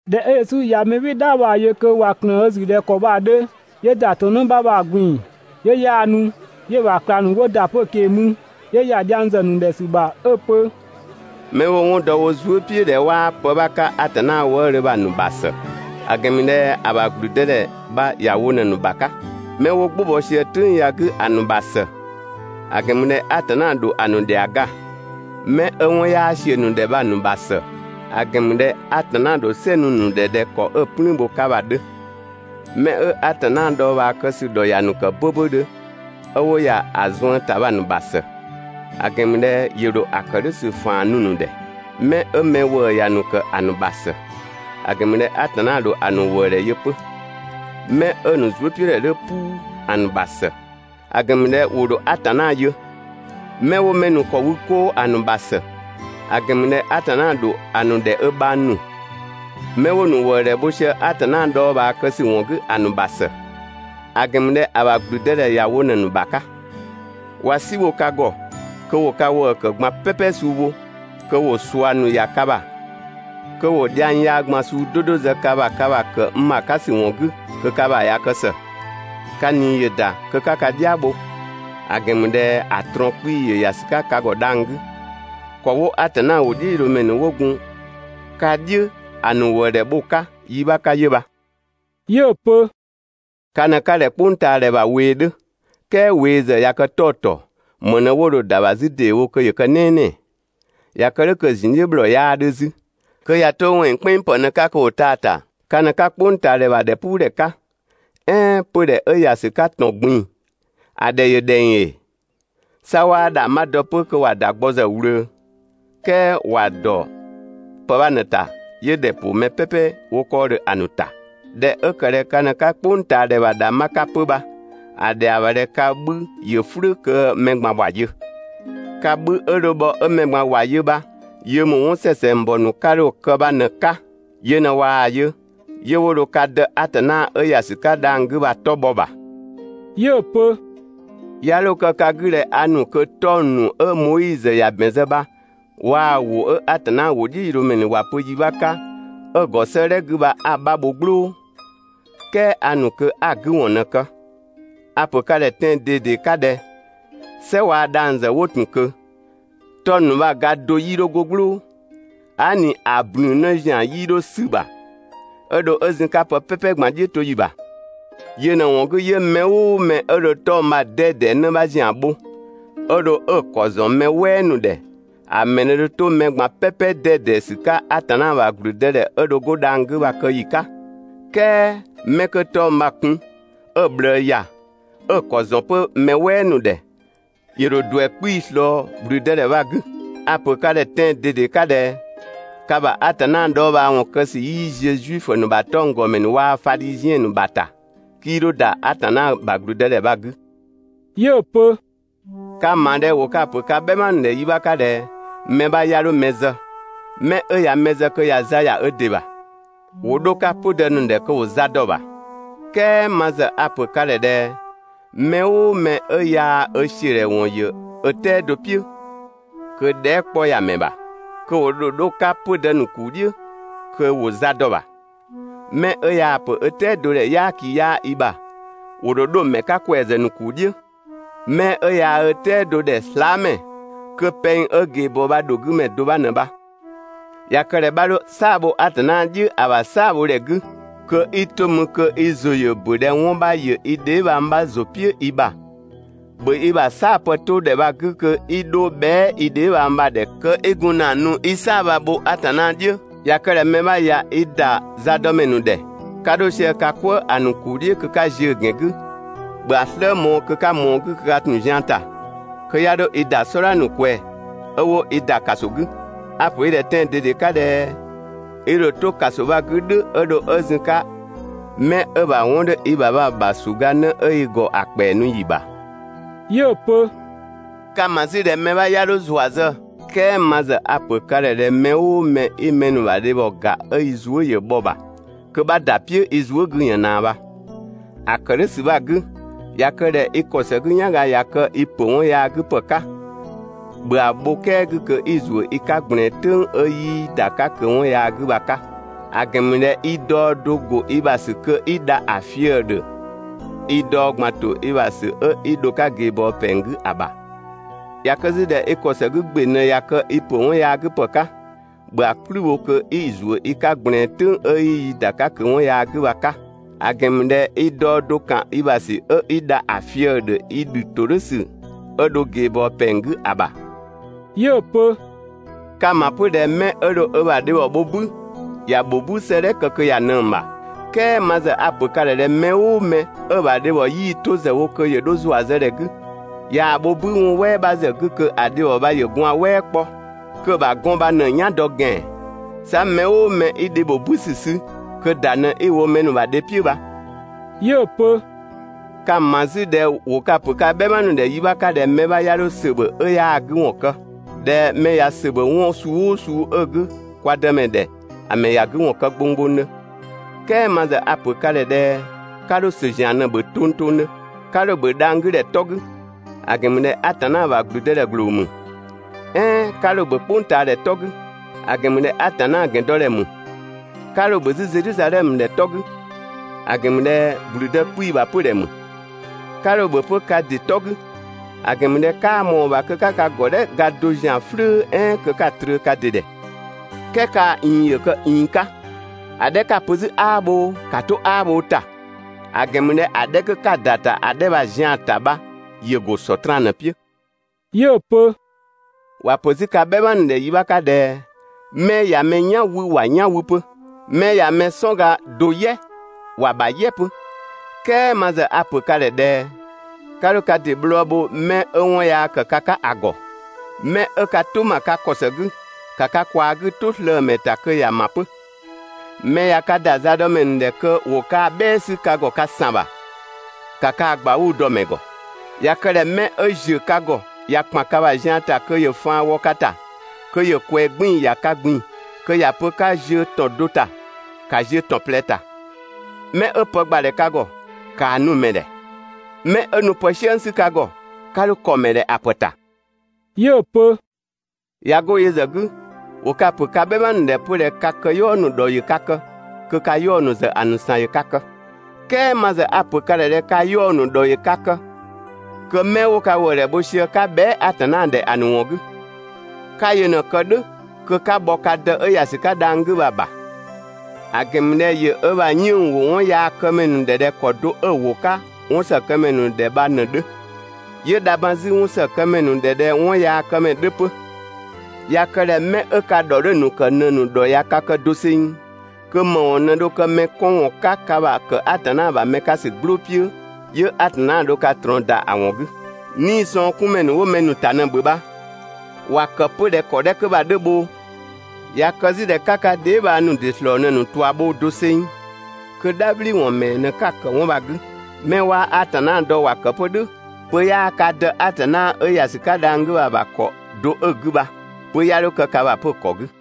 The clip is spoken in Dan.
꞊Dhɛ 'ö Yesu ꞊ya mɛ "bhɩɩ‑ "dhaa bha‑ yö kö ꞊wa ꞊klëën ö ‑zü ꞊dhɛ ‑kɔ bha‑ 'dhö, 'yö ‑da ‑tɔn 'në 'bha bha‑ ꞊gbin‑ 'yö 'yaanu. 'Yö‑ ‑bha ꞊klangdhiʋ̈ ‑nu 'wo ‑da 'pö‑ ꞊keng‑ mü. 'Yö ‑ya dhiang zë ‑sü ‑bha ‑a ‑nu ‑dhɛ 'ö‑ pö: «'Mɛ 'wo‑ 'wɔn dɔ wo zuë" "piʋ̈ ꞊dhɛ 'waa pë 'bha 'ka Atanna wëëdhö bha‑ ‑nu ‑bha ‑së; ‑a ‑gɛn ‑mü ꞊dhɛ ‑a ‑bha ‑gblüdëdhɛ bha ‑ya wo ꞊në‑ ‑nu ‑bha 'ka. 'Mɛ 'wo "gbʋ bɔ sië "tʋ̈ng ya‑ 'gü ‑a ‑nu ‑bha ‑së, ‑a ‑gɛn ‑mü ꞊dhɛ Atanna ‑dho ‑a ‑nu ‑dhɛa ga. 'Mɛ 'ö 'wɔn 'yaa ‑siö ‑nu ‑dhɛ bha‑ ‑nu ‑bha ‑së, ‑a ‑gɛn ‑mü ꞊dhɛ Atanna ‑dho "sɛ nu‑ ‑nu ‑dhɛ yi do 'ka ꞊dhɛ ‑kɔ 'ö‑ "plüün bho‑ 'ka bha‑ 'dhö. 'Mɛ 'ö Atanna dhɔɔbhaa kë ‑sü ‑dhɔ ‑ya ‑nu ‑kë 'böbödhö 'ö 'wo ‑ya ‑a zuën ‑ta bha‑ ‑nu ‑bha ‑së, ‑a ‑gɛn ‑mü ꞊dhɛ ‑yö ‑dho ‑a ‑kë "dhʋ̈ ‑sü ‑faan nu‑ ‑nu ‑dhɛ. 'Mɛ 'ö mɛ ‑wëë ‑ya ‑nu ‑kë ‑a ‑nu ‑bha ‑së, ‑a ‑gɛn ‑mü ꞊dhɛ Atanna ‑dho ‑a ‑nu ‑wëëdhɛ yö 'pö. 'Mɛ 'ö‑ ‑nu zuëpiʋ̈dhɛ 'dhö "puu ‑a ‑nu ‑bha ‑së, ‑a ‑gɛn ‑mü ꞊dhɛ ‑wo ‑dho Atanna yö. 'Mɛ 'wo mɛ ‑nu ‑kɔ wü 'koo ‑a ‑nu ‑bha ‑së, ‑a ‑gɛn ‑mü ꞊dhɛ Atanna ‑dho ‑a ‑nu ‑dhɛ ö bhang ‑nu. Mɛ 'wo‑ ‑nu ‑wëëdhɛ bho sië Atanna dhɔɔbhaa kë ‑sü ‑wɔn 'gü ‑a ‑nu ‑bha ‑së, ‑a ‑gɛn ‑mü ꞊dhɛ ‑a ‑bha ‑gblüdëdhɛ ‑ya wo ꞊në‑ ‑nu ‑bha 'ka. ꞊Wa "si bho ka ‑gɔ kö ‑wo ka ‑wëë ‑kë ꞊gban "pɛpɛ suu wo, kö ‑wo ꞊sua ‑nu ‑ya ka ‑bha, kö ‑wo dhiang yaa ꞊gban suu 'do 'do zë ka ‑bha ka ‑bha ‑kë n ‑bha 'ka ‑sü ‑wɔn 'gü kö ka ‑bha ꞊ya kë ‑së, ka ꞊nii ‑yö ‑da kö 'ka ka "dhia bho, ‑a ‑gɛn ‑mü ꞊dhɛ ‑a ꞊trɔɔn 'kpii‑ ‑yö ‑ya ‑sü 'ka ka ‑gɔ dhang‑ 'gü. ‑Kɔ 'wo Atanna ‑wʋdhiʋ̈loomɛ ‑nu 'wo gun ka "dhiʋ̈ ‑a ‑nu ‑wëëdhɛ bho‑ 'ka yi 'bha 'ka 'yö bha.» 'Yö‑ pö: «Ka ꞊në 'ka ꞊dhɛ "kpʋngtaadhɛ ‑bha ꞊wee 'dhö, "kɛɛ ꞊wee ‑zë ꞊ya kë 'ɔtɔɔ, ‑më ꞊në 'wo dho‑ ‑da ‑bha 'zü ‑deewo kö ‑yö kë "nɛɛnɛɛ? ꞊Ya kë "dhʋ̈ kö‑ ‑zun "dhiʋ̈ ‑bhlɔɔ 'yaa 'dhö 'zü, kö ꞊ya 'to ‑wɛnng "kpɛnng ‑pë ꞊në‑ 'ka kö ‑wo taa‑ ‑ta. Ka ꞊në 'ka "kpʋngtaadhɛ ‑bha ‑dhɛpuudhɛ 'ka, "ɛɛn 'pödhɛ 'ö ‑ya ‑sü 'ka ‑tɔn ꞊gbin‑ ‑a ‑dhɛ ‑yö ‑dhɛng ‑ee? 'Sa 'waa ‑dhangbha dɔ 'pö 'waa‑ ‑da gbɔ ‑zë ꞊wlöö, "kɛɛ ‑wa ‑dɔ pë 'bha ꞊në‑ ‑ta 'yö ‑dhɛ ‑pʋ mɛ "pɛpɛ 'wo 'kɔɔdhö ‑a ‑nu ‑ta. ꞊Dhɛ 'ö ‑kë ꞊dhɛ ka ꞊në 'ka "kpʋngtaadhɛ ‑bha ‑dhangbha 'ka 'pö bha, ‑a ‑dhɛa ‑bha ꞊dhɛ ka 'bhü ‑yö "flʋ̈ kö mɛ ꞊gban ‑wa yö. Ka 'bhü 'ö dho bhɔ 'ö mɛ ꞊gban ‑wa yö bha yö ‑mü 'wɔn ‑sɛsɛngbɔ ‑nu 'ka dho‑ kë bha ꞊në‑ 'ka, yö ꞊në ꞊waa‑ yö, 'yö 'wo dho ka Dë Atanna 'ö ‑ya ‑sü 'ka dhang‑ 'gü bha‑ 'tɔ bhɔ‑ ‑bha.» 'Yö‑ pö: «'Ya 'dho kë ka 'gü ꞊dhɛ a ‑nu kö 'tɔng‑ ‑nu 'ö Moizö ‑ya ‑bɛn zë bha waa‑ ‑wʋ ‑nu 'ö Atanna ‑wʋdhiʋ̈loomɛ ‑nu ‑wa pö yi 'bha 'ka 'ö‑ ‑gɔ 'sëëdhɛ 'gü bha 'a‑ 'bha bho "gblʋʋ, "kɛɛ a ‑nu kö 'a‑ 'gü ‑wɔn ꞊në‑ kë. A‑ ‑pö ka ‑dhɛ tɛan‑ ꞊dede 'ka ꞊dhɛ: "Sɛ waa‑ dhang‑ ‑zë 'wo ‑tun ꞊kö, 'tɔng‑ ‑nu bha‑ ga do 'yii 'dho 'go "gblʋʋ, aa" ꞊ni ‑a ꞊blün 'në ‑zian 'yii dho 'sü‑ ‑bha 'ö dho 'ö zun‑ 'ka pë "pɛpɛ ꞊gban "dhiʋ̈toyi ‑bha. Yö ꞊në‑ ‑wɔn 'gü 'yö mɛ "ʋʋ mɛ 'ö dho 'tɔng‑ bha‑ 'dɛdɛ 'në 'bha ‑zian bho, 'ö dho 'ö‑ ‑kɔ ‑zɔn mɛ "wɛɛ ‑nu ‑dhɛ, ‑a ‑mɛ ꞊në dho 'to mɛ ꞊gban "pɛpɛ 'dɛdɛ ‑sü 'ka Atanna ‑bha ‑gblüdëdhɛ 'ö dho 'go dhang‑ 'gü bha‑ kë ‑yi 'ka. "Kɛɛ 'mɛ 'kö 'tɔng‑ bha‑ kun, 'ö‑ ꞊bhlëë ‑ya, 'ö‑ ‑kɔ ‑zɔn 'pö mɛ "wɛɛ ‑nu ‑dhɛ, ‑yö ‑dho ‑duɛ 'kpii‑ ꞊slɔɔ ‑gblüdëdhɛ bha‑ 'gü. A‑ ‑pö ka ‑dhɛ tɛan‑ ꞊dede 'ka ꞊dhɛ: Ka ‑bha Atanna dhɔɔbhaawɔn kë ‑sü 'yii ziö Zuifö ‑nu ‑bha 'tɔnggɔmɛ ‑nu waa‑ Fadhiziɛn ‑nu ‑bha ‑ta, 'kii 'dho ‑da Atanna ‑bha ‑gblüdëdhɛ bha‑ 'gü.» 'Yö‑ pö: «Ka‑ ‑ma ꞊dhɛ ‑wo ka‑ ‑pö ka "bhɛma ‑nu ‑dhɛ yi 'bha 'ka ꞊dhɛ: Mɛ 'bha 'ya 'dho mɛ zë, mɛ 'ö ya mɛ zë kö ꞊ya za ‑ya ö ‑dɩ ‑bha. ‑Wo 'dho‑ 'ka 'pödë ‑nu ‑dhɛ kö ‑wo za dɔ‑ ‑bha, "kɛɛ ma ‑zë a‑ ‑pö ka ‑dhɛ: Mɛ "ʋʋ mɛ 'ö yaa‑ ö ‑siö ‑dhɛ ‑wɔn ‑yö ö "tɛado "piʋ̈ kö dhɛɛ" 'kpɔ ‑ya ‑mɛ ‑bha, kö ‑wo ‑dho 'dho‑ 'ka 'pödë ‑nu ‑kuu "dhiʋ̈ kö ‑wo za dɔ‑ ‑bha. Mɛ 'ö yaa‑ ‑pö ö "tɛado ‑dhɛ "yaaki 'yaa i ‑bha, ‑wo ‑dho 'dho‑ ‑mɛ 'ka ‑kwɛazë ‑nu ‑kuu "dhiʋ̈. Mɛ 'ö yaa ö "tɛado ‑dhɛ slaamɛ, kö pɛng 'ö ꞊geebɔɔ bha ‑dho 'gü ‑mɛ do 'bha ꞊në bha. ꞊Ya kë ꞊dhɛ 'bha 'dho "saa‑ bho Atanna "dhiʋ̈ ‑a ‑bha "saabhodhɛ 'gü, kö 'i 'to mü kö i ‑zʋ ‑yö ‑bö ꞊dhɛ 'wɔn 'bha ‑yö i dheebhang 'bha ‑zʋ "piʋ̈ i ‑bha, ‑bhö i ‑bha "saapë 'to ‑dhɛ bha‑ 'gü kö 'i 'dho bhɛa" i dheebhang bha‑ ‑dhɛ kö i gun ‑na nu 'i "saa‑ bha‑ bho Atanna "dhiʋ̈. ꞊Ya kë ꞊dhɛ mɛ 'bha ꞊ya i ‑da zadɔmɛ ‑nu ‑dhɛ, 'ka 'dho sië ka "kwëë ‑a ‑nu ‑kuu "dhiʋ̈ kö 'ka ziö‑ ‑gɛn 'gü, ‑bhö ‑a "slë mɔɔ‑ kö 'ka ꞊mɔɔ‑ 'gü kö ka ‑tun zian ‑ta. Kö 'ya 'dho i ‑da "sɔdha ‑nu ꞊kwɛɛ‑ 'ö 'wo i ‑da ‑kaso 'gü. A‑ ‑pö i ‑dhɛ tɛan‑ ꞊dede 'ka ꞊dhɛ i ‑dho 'to ‑kaso bha‑ 'gü "dhʋ̈ 'ö dho 'ö zun‑ 'ka mɛ 'ö‑ ‑bha 'wɔn 'dhö i ‑bha bha‑ ‑bha ‑suganë 'ö i ‑gɔ ‑a ‑kpɛa nu ‑yi ‑bha.» 'Yö‑ pö: «Ka‑ ‑ma 'zü ꞊dhɛ mɛ 'bha 'ya 'dho ‑zua zë, "kɛɛ ma ‑zë a‑ ‑pö ka ‑dhɛ ꞊dhɛ mɛ "ʋʋ mɛ 'i mɛ ‑nu ‑bha dhe yö, 'ö i zuë" ‑yö bhɔ‑ ‑bha kö 'bha ‑da "piʋ̈ i zuë" 'gü ꞊yën ꞊naa bha. ‑A ‑kë "dhʋ̈ ‑sü bha‑ 'gü, ꞊ya kë ꞊dhɛ i ‑kɔ ‑së 'gü "yanga ꞊ya kë i ‑pö 'wɔn yaa 'gü ‑pë 'ka, ‑bhö ‑a bho "kɛa 'gü kö 'i‑ ‑zuö i 'ka ꞊gblɛɛn, ("tʋ̈ng 'ö 'yii i ‑da 'ka ꞊kö 'wɔn yaa 'gü bha‑ 'ka); ‑a ‑gɛn ‑mü ꞊dhɛ i daɔ do ‑go i ‑bha ‑sü kö 'i dha ‑a fië‑ ‑dhö i daɔ ꞊gban ‑to i ‑bha ‑sü 'ö 'i dho ꞊geebɔɔ ‑pɛng 'gü ‑a ‑bha. ꞊Ya kë 'zü ꞊dhɛ i ‑kɔ ‑së 'gü ‑gbe ꞊në ꞊ya kë i ‑pö 'wɔn yaa 'gü ‑pë 'ka, ‑bhö ‑a "kplü bho kö 'i‑ ‑zuö i 'ka ꞊gblɛɛn, ("tʋ̈ng 'ö 'yii i ‑da 'ka ꞊kö 'wɔn yaa 'gü bha‑ 'ka); ‑a ‑gɛn ‑mü ꞊dhɛ i daɔ do ‑kan i ‑bha ‑sü 'ö 'i dha ‑a fië‑ ‑dhö i ‑dhü ‑todhʋ̈sü 'ö dho ꞊geebɔɔ ‑pɛng 'gü ‑a ‑bha.» 'Yö‑ pö: «Ka‑ ‑ma 'pö ꞊dhɛ mɛ 'ö dho ö ‑bha dhebhɔ bho "bü, ‑ya ‑bho "bü 'sëëdhɛ kë kö ‑ya ꞊nëng‑ ‑bha, "kɛɛ ma ‑zë a‑ ‑pö ka ‑dhɛ ꞊dhɛ mɛ "ʋʋ mɛ 'ö‑ ‑bha dhebhɔ 'yii‑ to ‑zë wo kö ‑yö dho ‑zua zë ‑dhɛ 'gü, ꞊yaa‑ bho "bü 'wɔn "wɛɛ 'bha ‑zë 'gü kö ‑a dhebhɔ bha ‑yö gwaan‑ "wɛɛ 'kpɔ, kö‑ ‑bha gɔn bha ꞊në‑ "yan dɔ ‑gɛan. 'Sa mɛ "ʋʋ mɛ 'i dhe ‑bho "bü ‑sü sü, kö ‑da ꞊në 'i‑ wo mɛ ‑nu ‑bha dhe "piʋ̈ bha.» 'Yö‑ pö: «Ka‑ ‑ma 'zü ꞊dhɛ ‑wo ka‑ ‑pö ka "bhɛma ‑nu ‑dhɛ yi 'bha 'ka ꞊dhɛ mɛ 'bha 'ya 'dho ‑sö ‑bhö 'ö 'yaa‑ 'gü ‑wɔn kë, ꞊dhɛ mɛ ꞊ya ‑sö ‑bhö 'wɔn suu "ʋʋ suu 'ö‑ 'gü kwa Dëmɛ ‑dhɛ, ‑a ‑mɛ ‑ya 'gü ‑wɔn kë gbonggbongdhö, "kɛɛ ma ‑zë a‑ ‑pö ka ‑dhɛ ꞊dhɛ 'ka 'dho ‑sö ‑zian ꞊në‑ ‑bhö tongtongdhö. 'Ka 'dho‑ ‑bhö dhang‑ 'gü ‑dhɛ 'tɔ 'gü, ‑a ‑gɛn ‑mü ꞊dhɛ Atanna ‑bha ‑gblüdëdhɛ ‑gbloo ‑mü. "Ɛɛn 'ka 'dho‑ ‑bhö "kpʋngtaadhɛ 'tɔ 'gü, ‑a ‑gɛn ‑mü ꞊dhɛ Atanna ‑gɛndɔdhɛ ‑mü. 'Ka 'dho‑ ‑bhö 'zü Zedhizadhɛmö ‑dhɛ 'tɔ 'gü, ‑a ‑gɛn ‑mü ꞊dhɛ ‑gblüdë 'kpii‑ ‑bha 'pödhɛ ‑mü. 'Ka 'dho‑ ‑bhö 'pö ka ‑dɩ 'tɔ 'gü, ‑a ‑gɛn ‑mü ꞊dhɛ 'kaa ꞊mɔɔ‑ ‑bha kö 'ka ka ‑gɔdhɛ ga do ‑zian "flʋ̈ "ɛɛn kö 'ka‑ trö ka ‑dɩ ‑dhɛ. "Kɛɛ kaa‑ ꞊iin ‑yö kë ꞊iin 'ka, ‑a 'dhɛ 'ka‑ pö 'zü 'aa bhoo, ‑ka 'to 'aa bhoo ‑ta, ‑a ‑gɛn ‑mü ꞊dhɛ ‑a 'dhɛ 'kö 'ka‑ ‑da ‑ta ‑a 'dhɛ bha‑ zian‑ ‑ta bha ‑yö ‑go Sɔtraan ꞊në‑ "piʋ̈.» 'Yö‑ pö: «‑Wa ‑pö 'zü ka "bhɛma ‑nu ‑dhɛ yi 'bha 'ka ꞊dhɛ: ‹'Mɛ ꞊ya mɛ "yan 'wü ‑wa "yan 'wü 'pö, 'mɛ ꞊ya mɛ "sɔnga do "yɛ ‑wa ‑bha "yɛ 'pö› "kɛɛ ma ‑zë a‑ ‑pö ka ‑dhɛ ꞊dhɛ: 'Ka 'dho ka ‑dɩ bhlɔɔ bho mɛ 'ö 'wɔn yaa ‑kë ka 'ka ‑a ‑gɔ. Mɛ 'ö ka "tʋ ‑ma ka ‑kɔ ‑së 'gü, ‑ka ka ꞊kwaa 'gü "tʋ slëë‑ ‑mɛ ‑ta kö ‑ya ‑ma 'pö. Mɛ ꞊ya ka ‑da zadɔmɛ ‑nu ‑dhɛ kö ‑wo kaa‑ "bhɛɛ 'sü ka ‑gɔ ka ‑san ‑bha, ‑ka kaa‑ ꞊gbauu‑ dɔ‑ ‑mɛ ‑gɔ. ꞊Ya kë ꞊dhɛ 'mɛ 'ö ‑ziö ka ‑gɔ ꞊ya ‑kpan ka ‑bha zian ‑ta kö ‑yö faan wɔ ka ‑ta kö ‑yö ꞊kwɛɛ 'gbiin‑ ‑ya ka ꞊gbin‑ kö ‑ya pö 'ka ziö ‑tɔn do ‑ta, ‑ka ziö ‑tɔn ꞊plɛ ‑ta. Mɛ 'ö pë ‑gbadhɛ ka ‑gɔ, ‑kaa nu‑ ‑mɛ ‑dhɛ, mɛ 'ö nu pë "siëng 'sü ka ‑gɔ, 'ka 'dho ‑kɔ ‑mɛ ‑dhɛ ‑a ‑pë ‑ta.» 'Yö‑ pö: «꞊Ya 'go yö ‑zë 'gü, ‑wo ka‑ ‑pö ka "bhɛma ‑nu ‑dhɛ 'pö ꞊dhɛ ka këyɔɔ ‑nu ‑dhɔ ‑yö ka kë kö ka 'yaɔ‑ ‑nu ‑zë ‑a ‑nu ‑san ‑yö ka kë. "Kɛɛ ma ‑zë a‑ ‑pö ka ‑dhɛ ꞊dhɛ ka 'yaɔ‑ ‑nu ‑dhɔ ‑yö ka kë kö 'mɛ 'wo ka ‑wëëdhɛ bho sië 'ka bhɛa" Atanna ‑dhɛ ‑a ‑nu ‑wɔn 'gü. 'Ka yö ꞊në‑ kë "dhʋ̈ kö 'ka bhɔ ka Dë 'ö ‑ya ‑sü 'ka dhang‑ 'gü bha‑ ‑bha. ‑A ‑gɛn ‑mü ꞊dhɛ ‑yö ö ‑bha 'yënng‑ ‑wo 'wɔnyaakëmɛ ‑nu ‑dhɛ ꞊dhɛ ‑kɔ do 'ö‑ ‑wo 'ka 'wɔnsëkëmɛ ‑nu ‑dhɛ bha ꞊në‑ 'dhö, 'yö dha ban 'zü ö 'wɔnsëkëmɛ ‑nu ‑dhɛ ꞊dhɛ 'wɔnyaakëmɛ 'dhö 'pö. ‑Ya kë ꞊dhɛ 'mɛ 'ö ka ‑dhɔ 'dhö‑ ‑nu ‑kë ꞊në‑ ‑nu ‑dhɔ ꞊ya ka kë doseng kö ‑më ‑wɔn ꞊në dho kë mɛ 'kɔn ‑wɔn 'ka ka ‑bha ‑kë Atanna ‑bha mɛ 'ka ‑sü "gblʋʋ "piʋ̈, 'yö Atanna dho ka ꞊trɔɔn ‑da ‑a ‑wɔn 'gü. 'Niisɔngkunmɛ ‑nu ('wo mɛ ‑nu ‑ta ꞊në‑ ‑bhö bha) ‑wa ‑kë 'pö ꞊dhɛ ‑kɔ 'dhɛ 'kö bha‑ 'dhö bhoo! ꞊Ya kë 'zü ꞊dhɛ 'ka ka dheebhang ‑nu ‑dɩ ‑slɔɔ ꞊në‑ ‑nu ꞊tua bho doseng kö "dhabhliwɔn ‑mɛɛ ꞊në 'ka‑ ‑kë 'wɔn bha‑ 'gü, mɛ 'waa Atanna dɔ ‑wa kë 'pö "dhʋ̈! Pö 'yaa ka Dë Atanna 'ö ‑ya ‑sü 'ka dhang‑ 'gü bha‑ ‑bha ‑kɔ do 'ö‑ 'gü bha, pö 'ya 'dho kë ka ‑bha 'pö‑ ‑kɔ 'gü.»